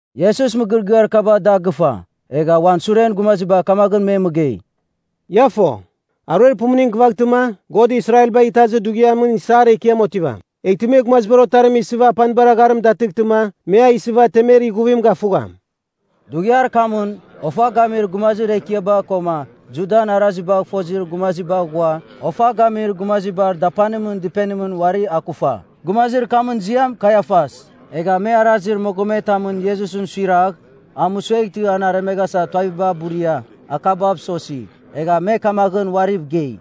Iesus mɨgɨrɨgɨar kaba da gɨfa, egha uan suren gumaziba kamaghɨn me mɨgei, “Ia fo, aruer pumuning gɨvaghtɨma, God Israelbagh Itazir Dughiamɨn isar ekiam otivam. Eghtɨ me Gumazibar Otarim isɨva apanibar agharim datɨghtɨma me a isɨva temer ighuvim gafugham.” Dughiar kamɨn, ofa gamir gumazir ekiaba koma Judan arazibagh fozir gumaziba ghua, ofa gamir gumazibar dapanimɨn dɨpenimɨn uari akufa. Gumazir kamɨn ziam Kaiafas. Egha me arazir mogometamɨn Iesusɨn suiragh a mɨsueghtɨ an aremeghasa tuaviba buria, akabav sosi. Egha me kamagh uariv gei,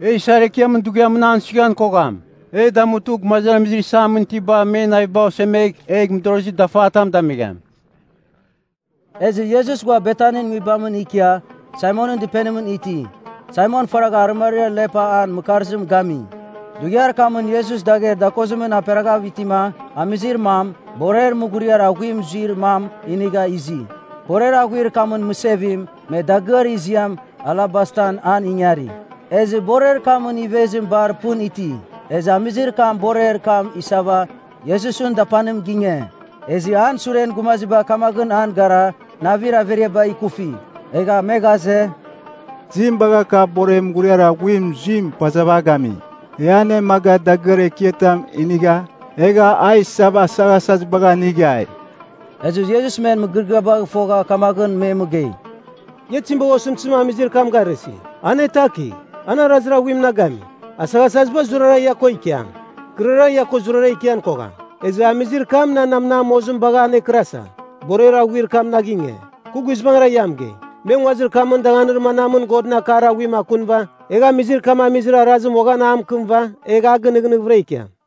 “E isar ekiamɨn dughiamɨn an suighan kogham. E damutɨ, gumazamizir isamɨn itiba men naviba osemegh, egh mɨdorozir dafatam damigham.” Ezɨ Iesus ghua Betanin nguibamɨn ikia, Saimonɨn dɨpenimɨn iti, Saimon faragha arɨmariam lepa an mɨkarzim gami. Dughiar kamɨn Iesus dagher dakozimɨn aperaghav itima, amizir mam, borer mughuriar aghuim zuir mam, inigha izi. Borer aghuir kamɨn mɨsevim, me dagɨar ziam alabastan an ingari. Ezɨ borer kamɨn ivezim bar pɨn iti. Ezɨ amizir kam borer kam isava, Iesusɨn dapanim ginge. Ezɨ an suren gumaziba kamaghɨn an gara, navir averiaba ikufi. Egha me ghaze, “Tizim bagha kav borer mughuriar aghuim zuim pazava a gami? E anemaga dagɨar ekiatam inigha egha a isava asaghasazibagh anighai.” Ezɨ Iesus men mɨgɨrɨgɨabagh fogha kamaghɨn me mɨgei, “Ia tizim bagha osɨmtɨzim amizir kam garɨsi? Anetakigh! An arazir aghuim na gami. Asaghasaziba zurara ia ko ikiam. Kɨrara, ia ko zurara ikian kogham. Ezɨ amizir kam nan namnam mozim bagh anekɨrasa, borer aghuir kam na ginge. Kɨ guizbangɨra ia mɨgei, me nguazir kamɨn danganir manamɨn Godɨn akar aghuim akunɨva egh amizir kam amizir arazim uaghan a mɨkɨmɨva egh a gɨnɨghnɨghɨvɨra ikiam.”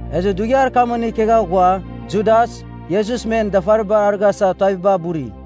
Ezɨ dughiar kamɨn ikegha ghua, Judas, Iesus men dafaribar arɨghasa tuaviba buri.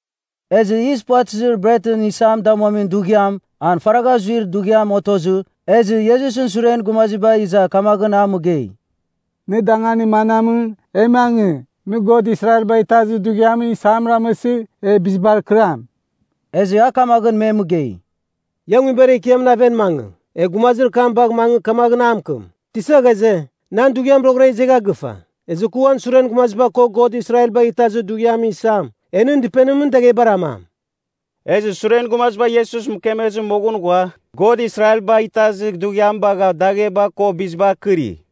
Ezɨ Yis Puvatɨzir Bretɨn Isam Damuamin Dughiam, an faragha zuir dughiam otozɨ, ezɨ Iesusɨn suren gumaziba iza kamaghɨn a mɨgei, “Nɨ danganir manamɨn, e mangɨ, nɨ God Israelbagh Itazir Dughiamɨn isam ramɨsɨ, e bizibar akɨram?” Ezɨ a kamaghɨn me mɨgei, “Ia nguibar ekiamɨn aven mangɨ, egh gumazir kam bagh mangɨ kamaghɨn a mɨkɨm, ‘Tisa ghaze, nan dughiam roghɨra izegha gɨfa. Ezɨ kɨ uan suren gumaziba ko, God Israelbagh Itazir Dughiamɨn isam, e nɨn dɨpenimɨn daghebar amam.’” Ezɨ suren gumaziba Iesus mɨkemezɨ moghɨn ghua God Israelbagh Itazir Dughiam bagha dagheba ko bizibar kɨri.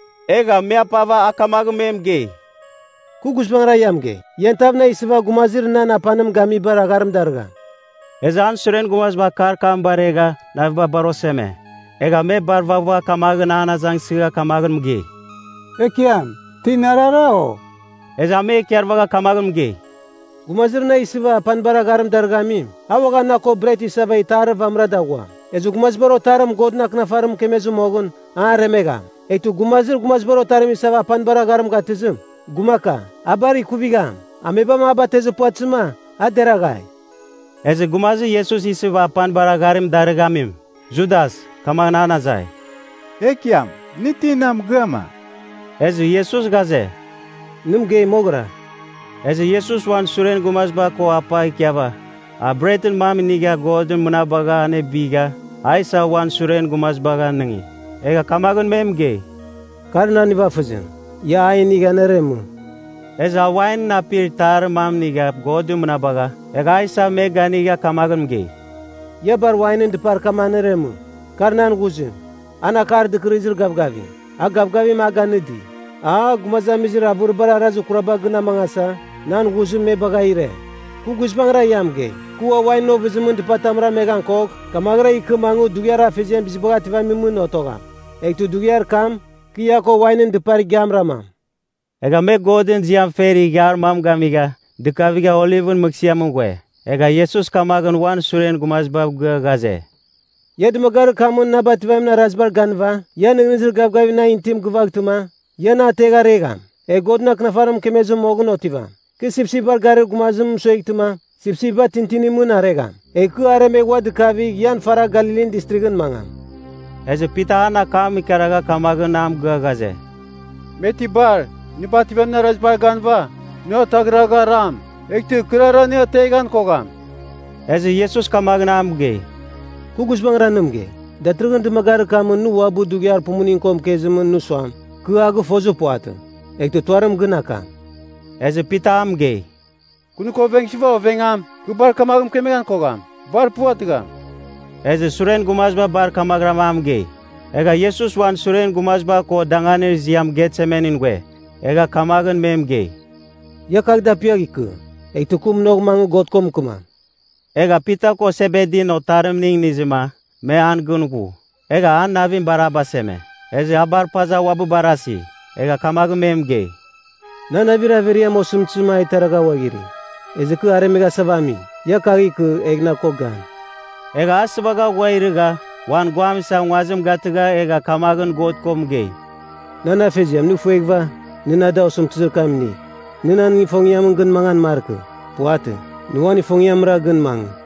Egha me apava a kamaghɨn me mɨgei, “Kɨ guizbangɨra ia mɨgei, ian tav na isɨva gumazir nan apanim gamibar agharim darɨgham.” Ezɨ an suren gumaziba akar kam baregha, naviba bar oseme. Egha me bar vaghvagha kamaghɨn an azangsɨgha kamaghɨn mɨgei, “Ekiam, ti narara, o?” Ezɨ a me ikarvagha kamaghɨn mɨgei, “Gumazir na isɨva apanibar agharim darɨghamim, a uaghan na ko bret isava itarir vamɨra daghuam. Ezɨ Gumazibar Otarim, Godɨn Akɨnafarim mɨkemezɨ moghɨn, an aremegham. Eghtɨ gumazir Gumazibar Otarim isava apanibar agharim gatɨzim, gumaka! A bar ikuvigham! Amebam a batezir puvatɨzɨma, a deraghai!” Ezɨ gumazir Iesus isɨva apanibar agharim darɨghamim, Judas kamaghɨn an azai, “Ekiam, nɨ ti na mɨgɨa, ma?” Ezɨ Iesus ghaze, “Nɨ mɨgei moghɨra!” Ezɨ Iesus uan suren gumaziba ko apa ikiava, a bretɨn mam inigha God mɨnabagha anebigha, a isa uan suren gumazibagh anɨngi. Egha kamaghɨn me mɨgei, “Kar nan nivafɨzim. Ia a inigh aneremɨ.” Ezɨ a wain apir itarir mam inigha God mɨnabagha, egha a isa me ganiga kamaghɨn mɨgei, “Ia bar wainɨn dɨpar kam aneremɨ. Kar nan ghuzim, an Akar Dɨkɨrɨzir Gavgavim, a gavgavim a ganɨdi. A, gumazamizir avɨribar arazir kuraba gɨn amangasa, nan ghuzim me bagha ire. Kɨ guizbangɨra ia mɨgei, kɨ ua wainɨn ovɨzimɨn dɨpatam rameghan kogh, kamaghɨra ikɨ mangɨ Dughiar Afeziam Bizibagh Ativamimɨn otogham. Eghtɨ dughiar kam, kɨ ia ko wainɨn dɨpar igiam ramam.” Egha me Godɨn ziam fer ighiar mam gamigha, dɨkavigha Olivɨn Mɨghsɨamɨn ghue. Egha Iesus kamaghɨn uan suren gumazibav gɨa ghaze, “Ia dɨmagarir kamɨn na bativamin arazibar ganɨva ian nɨghnɨzir gavgavir nan itim gɨvaghtɨma, ia na ategh aregham. Egh Godɨn Akɨnafarim mɨkemezɨ moghɨn otivam, ‘Kɨ sipsipbar garir gumazim mɨsueghtɨma, sipsipba tintinimɨn aregham.’ Egh kɨ aremegh ua dikavigh ian faragh Galilin Distrighɨn mangam.” Ezɨ Pita an akam ikaragha kamaghɨn a mɨgɨa ghaze, “Me ti bar, nɨ bativamɨn arazibar ganɨva, nɨ ataghragh aram, eghtɨ kɨrara nɨ ateghan kogham.” Ezɨ Iesus kamaghɨn a mɨgei, “Kɨ guizbangɨra nɨ mɨgei, datɨrɨghɨn dɨmagarir kamɨn nɨ uabɨ dughiar pumuning ko mɨkezim nɨ suam, ‘Kɨ a gɨfozir puvatɨ,’ eghtɨ tuarim gɨn akam.” Ezɨ Pita a mɨgei, “Kɨ nɨ ko ovengsɨva ovengam, kɨ bar kamaghɨn mɨkemeghan kogham. Bar puvatɨgham!” Ezɨ suren gumaziba bar kamaghɨram a mɨgei. Egha Iesus uan suren gumaziba ko danganir ziam Getsemanin ghue. Egha kamaghɨn me mɨgei, “Ia kagh dapiagh ikɨ, eghtɨ kɨ munagh mangɨ God ko mɨkɨmam.” Egha Pita ko Sebedin otarimning inizɨma, me an gɨn ghu. Egha an navim bar a baseme, ezɨ a bar paza uabɨ barasi. Egha kamaghɨn me mɨgei, “Nan navir averiam, osɨmtɨzim a iteragha ghuaghiri. Ezɨ kɨ aremeghasava ami. Ia kagh ikɨ, egh na ko gan.” Egha a sɨvagha ghua irɨgha, uan guam isa nguazim gatɨgha egha kamaghɨn God ko mɨgei, “Nan Afeziam nɨ ifueghɨva, nɨ na da osɨmtɨzir kam inigh. Nɨ nan ifongiamɨn gɨn mangan markɨ. Puvatɨ, nɨ uan ifongiamra gɨn mangɨ.”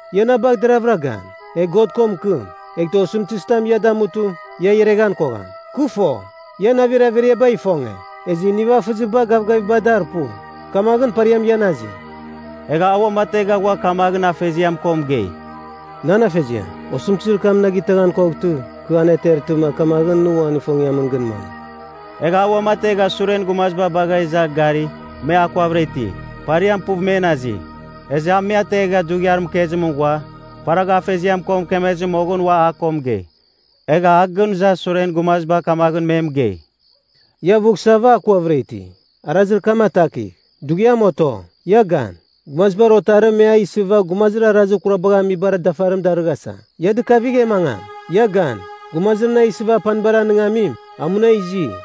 Ia na bagh deravɨra gan, egh God ko mɨkɨm, eghtɨ osɨmtɨzitam ia damutɨ, ia ireghan kogham. Kɨ fo, ian navir averiaba ifonge, ezɨ nivafɨziba gavgaviba dar pu. Kamaghɨn pariam ian azi.” Egha a uamategha ghua kamaghɨn Afeziam ko mɨgei, “Nan Afeziam, osɨmtɨzir kam na gitaghan koghtɨ, kɨ anetertɨma, kamaghɨn nɨ uan ifongiamɨn gɨn mangɨ.” Egha a uamategha suren gumaziba bagha iza gari, me akuavɨra iti. Pariam puv men azi. Ezɨ a me ategha dughiar mɨkezimɨn ghua, faragha Afeziam ko mɨkemezɨ moghɨn ua a ko mɨgei. Egha a gɨn iza suren gumaziba kamaghɨn me mɨgei, “Ia avughsava akuavɨra iti? Arazir kam atakigh! Dughiam oto. Ia gan, Gumazibar Otarim me a isɨva gumazir arazir kurabagh amibar dafarim darɨghasa. Ia dɨkavigh! E mangam! Ia gan. Gumazir na isɨva apanibar anɨngamim, a muna izi!”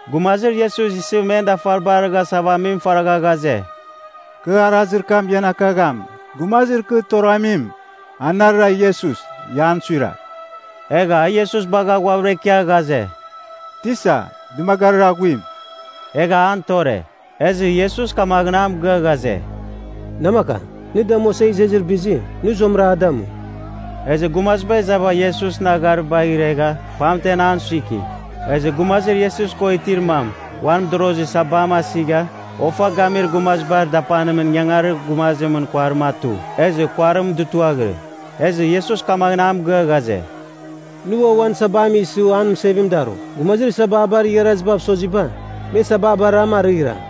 Gumazir Iesus isɨ men dafaribar arɨghasava amim faragha ghaze, “Kɨ arazir kam ian akagham. Gumazir kɨ toramim, anarɨra Iesus. Ia an suiragh.” Egha a Iesus bagha ghuavɨra ikia ghaze, “Tisa, dɨmagarir aghuim,” egha an tore. Ezɨ Iesus kamaghɨn a mɨgɨa ghaze, “Namakam, nɨ damuasa izezir bizim, nɨ zuamɨra a damu.” Ezɨ gumaziba izava Iesusɨn agharibagh iregha, pamtem an suiki. Ezɨ gumazir Iesus ko itir mam, uan mɨdorozir sabam asigha, ofa gamir gumazibar dapanimɨn ingangarir gumazimɨn kuarim atu, ezɨ kuarim dutuaghirɨ. Ezɨ Iesus kamaghɨn a mɨgɨa ghaze, “Nɨ ua uan sabam isɨ an mɨsevim darugh. Gumazir sababar igharazibav soziba, me sababaram arɨghiram.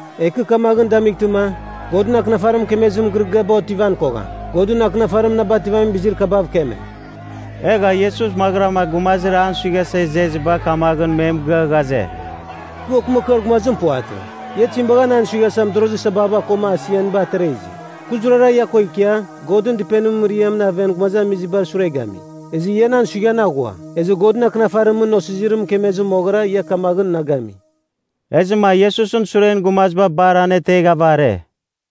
Egh kɨ kamaghɨn damightɨma, Godɨn Akɨnafarim mɨkemezir mɨgɨrɨgɨaba otivan kogham. Godɨn Akɨnafarim na bativamin bizir kabav keme.” Egha Iesus maghɨrama gumazir an suighasa izeziba kamaghɨn me mɨgɨa ghaze, “Kɨ okɨmakɨar gumazim puvatɨ. Ia tizim bagha nan suighasa mɨdorozir sababa koma asianiba atera izi? Kɨ zurara ia ko ikia, Godɨn Dɨpenimɨn mɨriamɨn aven gumazamizibar sure gami. Ezɨ ia nan suighan aghua. Ezɨ Godɨn Akɨnafarimɨn Osizirim mɨkemezɨ moghɨra ia kamaghɨn na gami.” Ezɨma Iesusɨn suren gumaziba bar aneteghava are.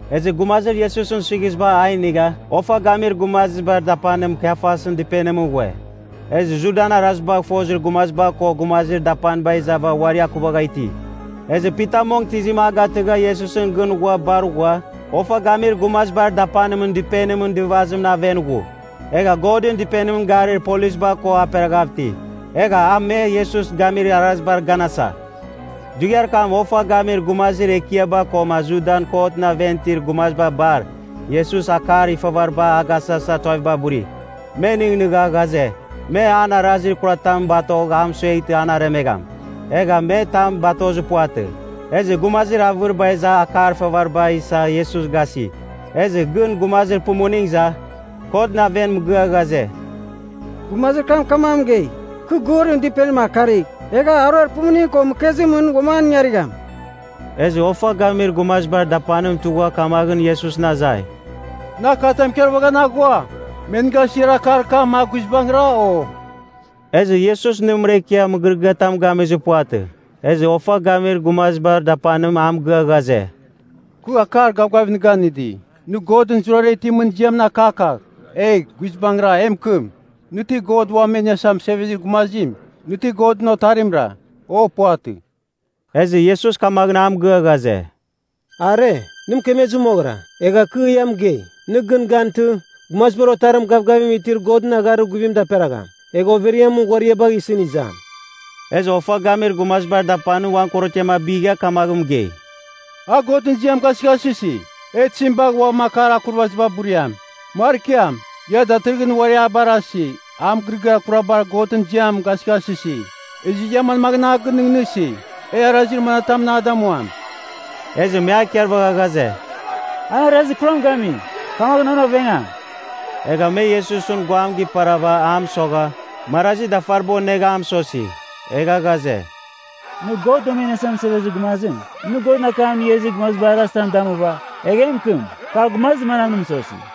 Ezɨ gumazir Iesusɨn suighiziba a inigha, ofa gamir gumazibar dapanim, Kaiafasɨn dɨpenimɨn ghue. Ezɨ Judan arazibagh fozir gumaziba ko gumazir dapaniba izava uari akuvagha iti. Ezɨ Pita mong tɨzim a gatɨgha Iesusɨn gɨn ghua bar ghua, ofa gamir gumazibar dapanimɨn dɨpenimɨn dɨvazimɨn aven ghu. Egha Godɨn Dɨpenimɨn garir polisba ko aperaghav iti. Egha a me Iesus gamir arazibar ganasa. Dughiar kam, ofa gamir gumazir ekiaba koma Judan kotɨn aven itir gumaziba bar, Iesus akar ifavaribar agasasa tuaviba buri. Me nɨghnɨgha ghaze, me an arazir kuratam batogh amɨsueghtɨ an aremegham. Egha me tam batozir puvatɨ. Ezɨ gumazir avɨriba iza akar ifavariba isa Iesus gasi. Ezɨ gɨn gumazir pumuning iza, kotɨn aven mɨgɨa ghaze, “Gumazir kam kamaghɨn mɨgei, ‘Kɨ Godɨn Dɨpenim akarigh, egh aruer pumuning ko mɨkezimɨn uam an ingarigham.’” Ezɨ ofa gamir gumazibar dapanim tugha kamaghɨn Iesusɨn azai, “Nɨ akatam ikarvaghan aghua? Me nɨ gasir akar kam, a guizbangɨra, o?” Ezɨ Iesus nɨmɨra ikia mɨgɨrɨgɨatam gamir puvatɨ. Ezɨ ofa gamir gumazibar dapanim a mɨgɨa ghaze, “Kɨ akar gavgavim nɨ ganɨdi, nɨ Godɨn zurara itimɨn ziamɨn akakagh, egh guizbangɨra e mɨkɨm. Nɨ ti, God Uam E Iniasa Mɨsevezir Gumazim, nɨ ti Godɨn Otarimra, o puvatɨ?” Ezɨ Iesus kamaghɨn a mɨgɨa ghaze, “Are, nɨ mɨkemezɨ moghɨra. Egha kɨ ia mɨgei, nɨ gɨn gantɨ, Gumazibar Otarim gavgavim itir Godɨn agharir guvim daperagham, egh overiamɨn ghuariabagh isɨn izam.” Ezɨ ofa gamir gumazibar dapanim uan korotiam abigha kamaghɨn mɨgei, “A Godɨn ziam gasɨghasɨsi! E tizim bagh ua akar akurvaziba buriam? Markiam! Ia datɨrɨghɨn uari a barasi, a mɨgɨrɨgɨar kurabar Godɨn ziam gasɨghasɨsi! Ezɨ ia manmaghɨn a gɨnɨghnɨsi, e arazir manatamɨn a damuam?” Ezɨ me a ikarvagha ghaze, “An arazir kuram gami, kamaghɨn an ovengam.” Egha me Iesusɨn guam giparava a mɨsogha, marazi dafariba onegha a mɨsosi. Egha ghaze, “Nɨ, God Uam E Iniasa Mɨsevezir Gumazim! Nɨ Godɨn akam inigha izir gumazibar arazitam damuva, egh e mɨkɨm, ‘Kar gumazir manam nɨ mɨsosi?’”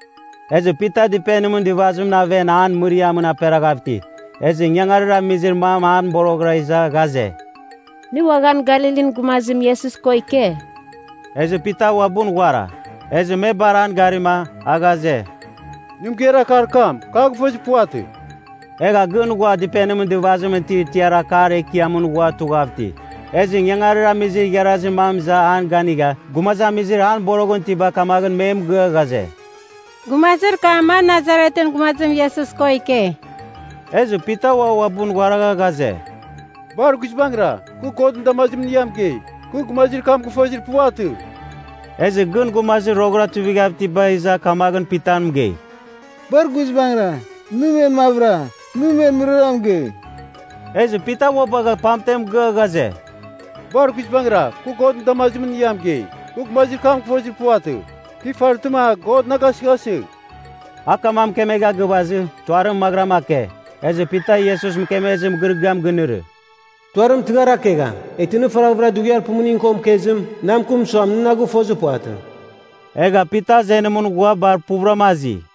Ezɨ Pita dɨpenimɨn dɨvazimɨn aven an mɨriamɨn aperaghav iti. Ezɨ ingangarir amizir mam an boroghɨra iza ghaze, “Nɨ uaghan Galilin gumazim Iesus ko ike.” Ezɨ Pita uabɨn ghuara, ezɨ me bar an garima, a ghaze, “Nɨ mɨgeir akar kam, kɨ a gɨfozir puvatɨ.” Egha gɨn ghua dɨpenimɨn dɨvazimɨn itir tiar akar ekiamɨn ghua tughav iti. Ezɨ ingangarir amizir igharazir mam iza an ganigha, gumazamizir an boroghɨn itiba kamaghɨn me mɨgɨa ghaze, “Gumazir kam, a Nasaretɨn gumazim Iesus ko ike.” Ezɨ Pita ua uabɨn ghuaragha ghaze, “Bar guizbangɨra, kɨ Godɨn damazimɨn ia mɨgei, kɨ gumazir kam gɨfozir puvatɨ.” Ezɨ gɨn gumazir roghɨra tuivighav itiba iza kamaghɨn Pita mɨgei, “Bar guizbangɨra, nɨ men mavɨra, nɨ men mɨrara mɨgei.” Ezɨ Pita ua bagha pamten mɨgɨa ghaze, “Bar guizbangɨra kɨ Godɨn damazimɨn ia mɨgei, kɨ gumazir kam gɨfozir puvatɨ. Kɨ ifartɨma, God na gasɨghasɨgh.” A kamaghɨn mɨkemegha gɨvazɨ, tuarim maghɨram ake. Ezɨ Pita Iesus mɨkemezir mɨgɨrɨgɨam ginɨrɨ, “Tuarim tɨghar akegham, eghtɨ nɨ faraghvɨra dughiar pumuning ko mɨkezim, na mɨkɨm suam, nɨ na gɨfozir puvatɨ.” Egha Pita azenimɨn ghua bar puvɨrama azi.